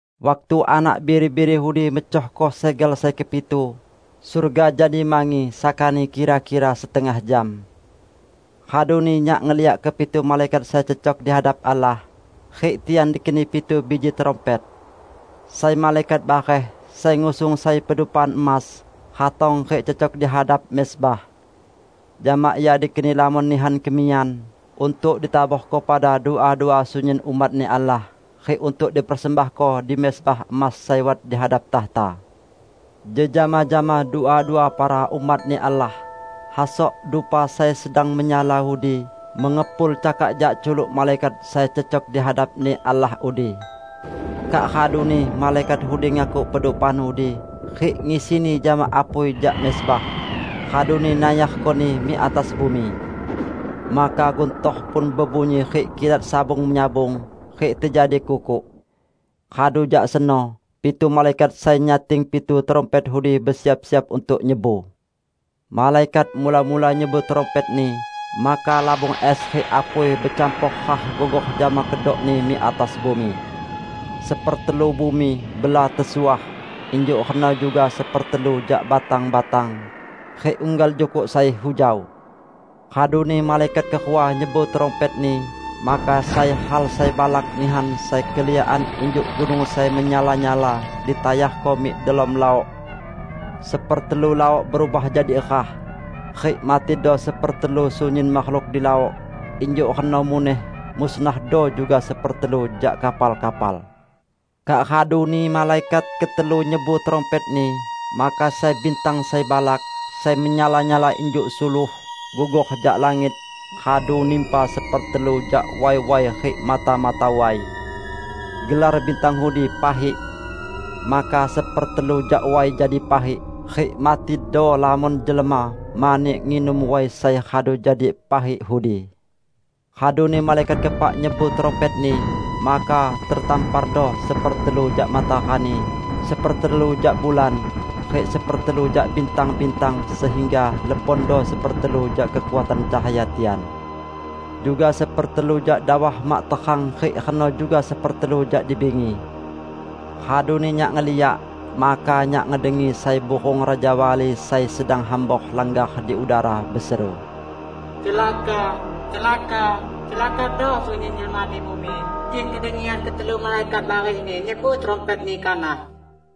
Waktu Anak Biri-biri udi mecohko segel sai kepitu, surga jadi mangi sakani kira-kira setengah jam. Raduni nyak ngeliak kepitu malaikat sai cecok di hadap Allah, rik tian dikeni pitu biji trumpet. Sai malaikat bareh, sai ngusung sai pedupaan emas, ratong rik cecok di hadap mezbah. Jama ia dikeni lamon nihan kemiyan untuk ditaborko pada dua-dua sunyin umat-Ni Allah rik untuk dipersembahko di mezbah emas sai wat di hadap takhta. Jejama jama dua-dua para umat-Ni Allah, hasok dupa sai sedang menyala udi mengepul cakak jak culuk malaikat sai cecok di hadap-Ni Allah udi. Kak raduni malaikat udi ngakuk pedupaan udi, rik ngisini jama apui jak mezbah, raduni nayarkoni mik atas bumi. Maka guntor pun bebunyi rik kilat sabung-menyabung, rik tejadi kukuk. Radu jak seno, pitu malaikat sai nyating pitu trumpet udi besiap-siap untuk nyebu. Malaikat mula-mula nyebu trumpetni, maka labung es rik apui becampor rah gugor jama kedokni mik atas bumi. Sepertelu bumi bela tesuah; injuk reno juga sepertelu jak batang-batang, rik unggal jukuk sai hujau. Raduni malaikat kerua nyebu trumpetni, maka sai hal sai balak nihan sai keliakan injuk gunung sai menyala-nyala ditayarko mik delom laok. Sepertelu laok berubah jadi rah, rik matido sepertelu sunyin makhluk di laok; injuk reno muneh musnahdo juga sepertelu jak kapal-kapal. Kak raduni malaikat ketelu nyebu trumpetni, maka sai bintang sai balak, sai menyala-nyala injuk suluh, gugor jak langit, raduni nimpa sepertelu jak way-way rik mata-mata way. (Gelar bintang udi "Pahik".) Maka sepertelu jak way jadi pahik, rik matido lamon jelma mani nginum way sai radu jadi pahik udi. Raduni malaikat keepak nyebu trumpetni. Maka tetampardo sepertelu jak matarani, sepertelu jak bulan, rik sepertelu jak bintang-bintang sehingga lebondo sepertelu jak kekuatan cahaya tian. Juga sepertelu jak dawah mak terang rik reno juga sepertelu jak di bingi. Raduni nyak ngeliak, maka nyak ngedengi sai burung rajawali sai sedang hambor langgar di udara, beseru, "Celaka! Celaka! Celakado sunyin jelma di bumi kik kedengian ketelu malaikat barehni nyebu trumpetni kanah!"